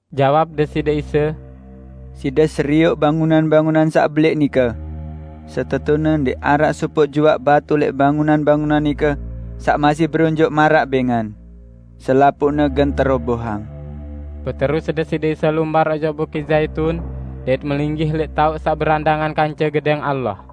Jawab Deside Isa, "Side serioq bangunan-bangunan saq belẽq nike? Setetune ndẽq araq sopoq juaq batu lẽq bangunan-bangunan nike saq masih beronjoq maraq bẽngan. Selapuqne gen terobohang." Beterus Deside Isa lumbar ojok Bukit Zaitun, dait melinggih lẽq taoq saq berandangan kance Gedẽng Allah.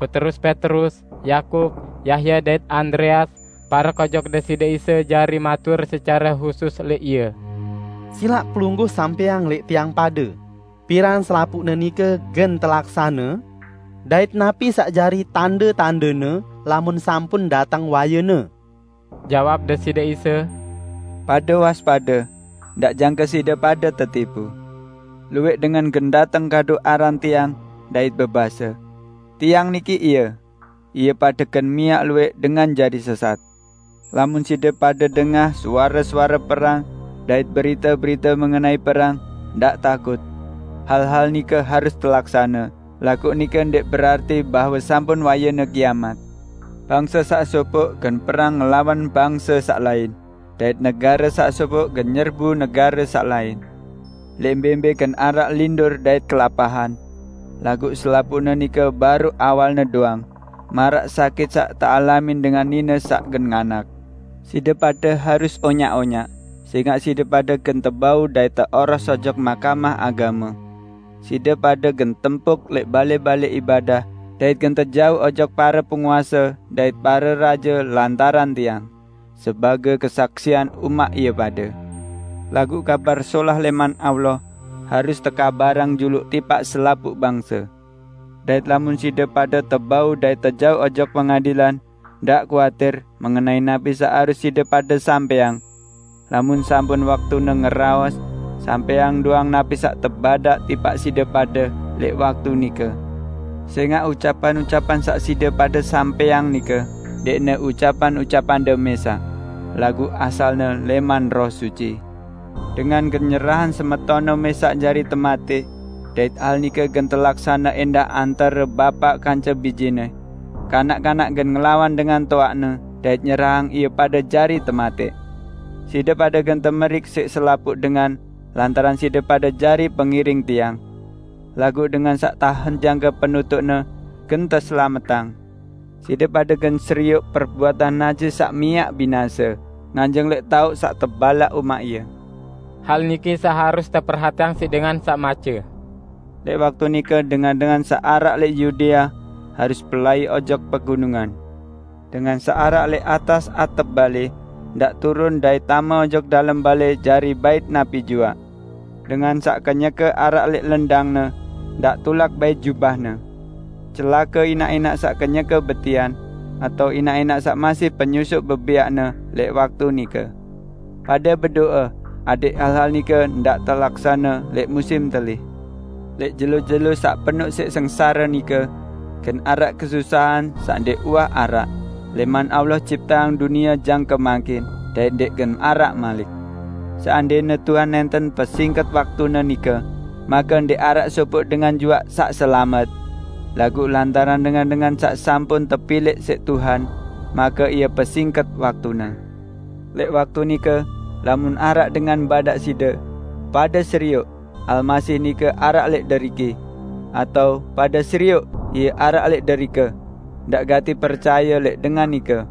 Beterus Petrus, Yakub, Yahya dait Andreas parek ojok Deside Isa jari matur secare husus lẽq Ie: "Silaq Pelungguh sampẽang lẽq tiang pade, piran selapuqne nike gen telaksane? Dait napi saq jari tande-tandene lamun sampun dateng wayene?" Jawab Deside Isa, "Pade waspade. Ndaq jangke side pade tetipu. Luwẽq dengan gen dateng kadu aran Tiang, dait bebase, 'Tiang niki Ie!' Ie pade gen miaq luwẽq dengan jari sesat. Lamun side pade dengah suare-suare perang dait berite-berite mengenai perang, ndaq takut. Hal-hal nike harus telaksane, laguq nike ndẽq berarti bahwe sampun wayene kiamat. Bangse saq sopoq gen perang ngelawan bangse saq lain, dait negare saq sopoq gen nyerang negare saq lain. Lẽq mbẽ-mbẽ gen araq lindur dait kelapahan. Laguq selapuqne nike baruq awalne doang, maraq sakit saq tealamin dengan nine saq gen nganak. Side pade harus onyaq-onyaq, sẽngaq side pade gen tebau dait teoros ojok Mahkamah Agame. Side pade gen tempuk lẽq balẽ-balẽ ibadah dait gen tejauq ojok pare penguase dait pare raje lantaran Tiang, sebagẽ kesaksian umaq ie pade. Laguq Kabar Solah lẽman Allah harus tekabarang juluq tipaq selapuq bangse. Dait lamun side pade tebau dait tejauq ojok pengadilan, ndaq kuatir mengenai napi saq harus side pade sampẽang. Lamun sampun waktune ngeraos, sampẽang doang napi saq tebadaq tipaq side pade lẽq waktu nike. Sẽngaq ucapan-ucapan saq side pade sampẽang nike ndẽqne ucapan-ucapande mẽsaq, laguq asalne lẽman Roh Suci. Dengan gen nyerahang semetonne mẽsaq jari tematẽq. Dait hal nike gen telaksane ẽndah antare bapaq kance bijene. Kanak-kanak gen ngelawan dengan toaqne dait nyerahang ie pade jari tematẽq. Side pade gen temeriq siq selapuq dengan lantaran side pade jari pengiring Tiang. Laguq dengan saq setie jangke penutuqne, gen teselametang." "Side pade gen serioq 'Perbuatan najis saq miaq binase' nganjeng lẽq taoq saq tebalaq umaq ie. (Hal niki saq harus teperhatiang siq dengan saq mace.) Lẽq waktu nike dengan-dengan saq araq lẽq Yudea harus pelai ojok pegunungan. Dengan saq araq lẽq atas atep balẽ, ndaq turun dait tame ojok dalem balẽ jari bait napi juaq. Dengan saq kenyeke araq lẽq lendangne, ndaq tulak bait jubahne. Celake inaq-inaq saq kenyeke betian, atao inaq-inaq saq masih penyusuq bebẽaqne lẽq waktu nike! Pade bedo'e adẽq hal-hal nike ndaq telaksane lẽq musim telih. Lẽq jelo-jelo saq penoq siq sengsare nike, gen araq kesusahan saq ndẽq uwah araq, lẽman Allah cipteang dunie jangke mangkin, dait ndẽq gen araq malik. Seandẽne Tuhan nẽnten pesingket waktune nike, make ndẽq araq sopoq dengan juaq saq selamet. Laguq lantaran dengan-dengan saq sampun tepilẽq siq Tuhan, make Ie pesingket waktune. Lẽq waktu nike, lamun araq dengan badaq side: 'Pade serioq, Almasih nike araq lẽq deriki!' atao 'Pade serioq, Ie araq lẽq derike!' -- ndaq gati percaye lẽq dengan nike.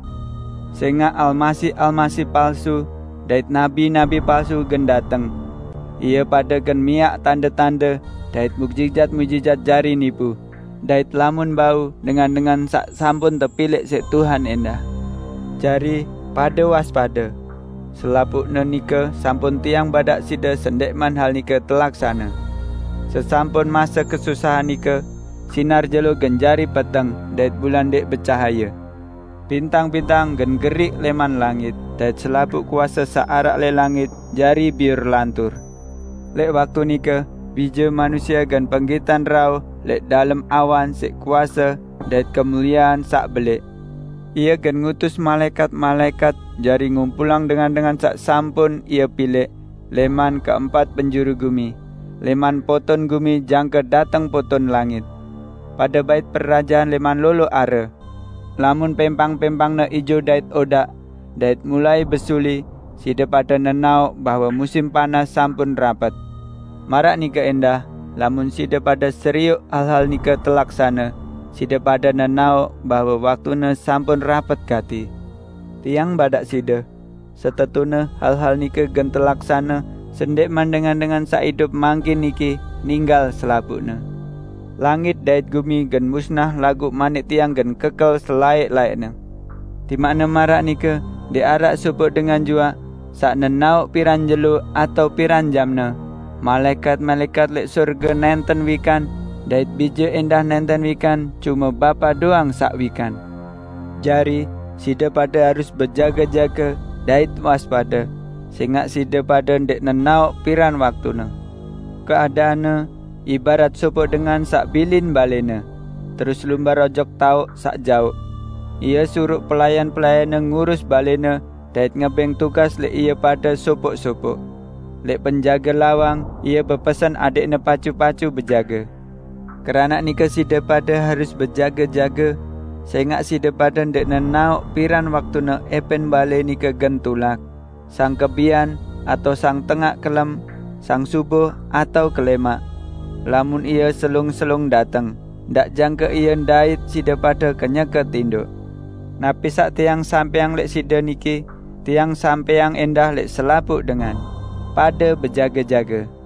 Sẽngaq almasih-almasih palsu dait nabi-nabi palsu gen dateng. Ie pade gen miaq tande-tande dait muqjizat-muqjizat jari nipu, dait lamun bau, dengan-dengan saq sampun tepilẽq siq Tuhan ẽndah. Jari, pade waspade! Selapuqne nike sampun Tiang badaq side sendẽqman hal nike telaksane." "Sesampun mase kesusahan nike, sinar jelo gen jari peteng dait bulan ndẽq becahaye. Bintang-bintang gen geriq lẽman langit dait selapuq kuase saq araq lẽq langit jari biur lantur. Lẽq waktu nike, Bije Manusie gen penggitan rauh lẽq dalem awan siq kuase dait kemuliean saq belẽq. Ie gen ngutus malaẽkat-malaẽkat jari ngumpulang dengan-dengan saq sampun Ie pilẽq lẽman keempat penjuru gumi, lẽman poton gumi jangke dateng poton langit." "Pade bait perajahan lẽman lolo are. Lamun pẽmpang-pẽmpangne ijo dait odaq, dait mulai besuli, side pade nenaoq bahwe musim panas sampun rapet. Maraq nike ẽndah lamun side pade serioq hal-hal nike telaksane, side pade nenaoq bahwe waktune sampun rapet gati. Tiang badaq side: Setetune hal-hal nike gen telaksane sendẽqman dengan-dengan saq idup mangkin niki ninggal selapuqne. Langit dait gumi gen musnah laguq manik Tiang gen kekel selaẽq-laẽqne." "Timaqne maraq nike ndẽq araq sopoq dengan juaq saq nenaoq piran jelo atao piran jamne. Malaẽkat-malaẽkat lẽq sorge nẽnten wikan dait Bije ẽndah nẽnten wikan, cume Bapa doang saq wikan. Jari, side pade harus bejage-jage dait waspade, sẽngaq side pade ndẽq nenaoq piran waktune. Keadaanne ibarat sopoq dengan saq bilin balẽne, terus lumbar ojok taoq saq jaoq. Ie suruq pelayan-pelayanne ngurus balẽne dait ngebẽng tugas lẽq ie pade sopoq-sopoq. Lẽq penjage lawang, ie bepesen adẽqne pacu-pacu bejage. Keranaq nike side pade harus bejage-jage, sẽngaq side pade ndẽq nenaoq piran waktune ẽpẽn balẽ nike gen tulak -- sang kebian atao sang tengaq kelem, sang subuh atao kelẽmaq. Lamun ie selung-selung dateng, ndaq jangke ie ndait side pade kenyeke tindoq. Napi saq Tiang sampẽang lẽq side niki, Tiang sampẽang ẽndah lẽq selapuq dengan: Pade bejage-jage!"